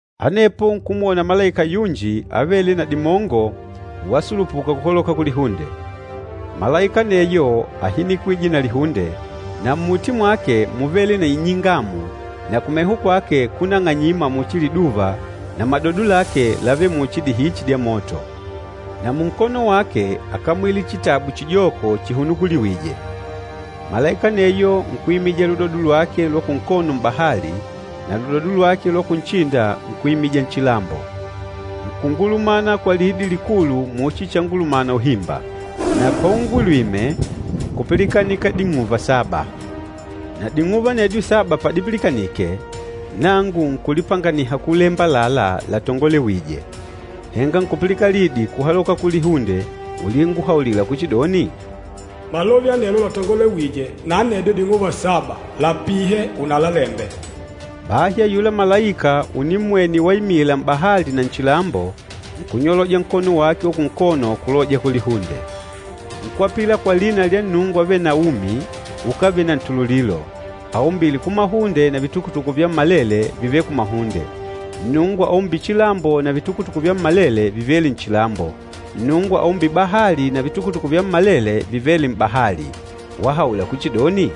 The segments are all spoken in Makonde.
Anepo nkumwona malaika yunji avêle na dimongo wasulupuka kuhaloka kulihunde. Malaika aneyo áhinikwije na lihunde, na mmuti mwake múvele na inyingamu na kumeho kwake kúnang'anyima muchi liduva na madodo lake lávele muchi dihichi dya moto. Na munkono wake ákamwile chitabu chijoko chihunukuliwîje. Malaika aneyo nkuimija ludodo lwake lwa kunkono m'bahali na ludodo lwa kunchinda nkuimija nchilambo. Nkungulumana kwa lidi likulu muchi changulumana uhimba. Na paungulwime, nkupilikanika ding'uva saba. Na ding'uva anedyo saba padipilikanike, nangu nkulipanganiha kulemba àlalá latongolewîje. Henga nkupilikana lidi kuhaloka kulihunde ulinguhaulila kuchidoni, “Malove anelo latongolewîje na anedyo ding'uva saba lapihe unalalembe.” Bahi ayula malaika unimmwene waimila m'bahali na nchilambo, nkunyoloja nkono wake wa kunkono kuloja kulihunde. Nkwapila kwa lina lya Nnungu avêle na umi ukávele na ntululilo, aumbîle kumahunde na vitukutuku vyammalele vivêle kumahunde, Nnungu aumbîle chilambo na vitukutuku vyammalele vivêle nchilambo, Nnungu aumbîle bahali na vitukutuku vyammalele vivêle m'bahali, wahaula kuchidoni,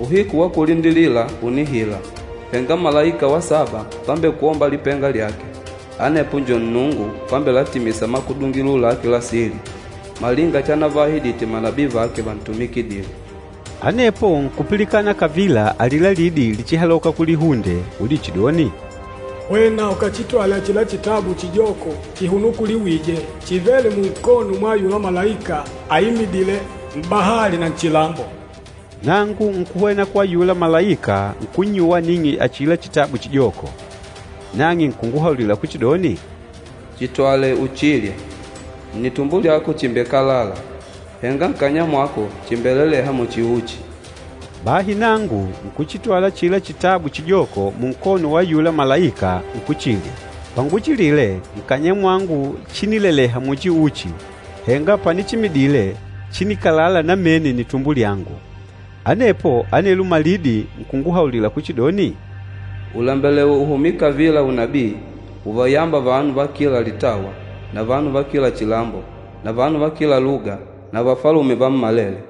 “Uhiku wa kulindilila ùnihila! Henga malaika wa saba pambekwomba lipenga lyake, anepo njo Nnungu pambelatimisa makudungilo lake la sili, malinga chanavaahidite manabii vake vantumikidîle.” Anepo nkupilikana kavila alila lidi lichihaloka kulihunde ulichidoni, “Hwena ukachitwale achila chitabu chijoko chihunukuliwije, chivêle munkono mwa ayula malaika aimidîle m'bahali na nchilambo.” Nangu nkuhwena kwa ayula malaika nkunnyuwa aning'e achila chitabu chijoko. Nang'e nkunguhaulila kuchidoni, “Chitwale uchilye. Nnitumbo lyako chimbekalala, henga nkanya mwako chimbeleleha muchi uchi.” Bahi nangu nkuchitwala achila chitabu chijoko munkono wa ayula malaika nkuchilya. Panguchilile, nkanya mwangu chínileleha muchi uchi, henga panichimidile, chínikalala namene nnitumbo lyangu. Anepo anelo malidi nkunguhaulila kuchidoni, “Ùlembelewa uhumye kavila unabii uvayâmba vanu va kila litawa na vanu va kila chilambo na vanu va kila luga na vafalume vammalele.”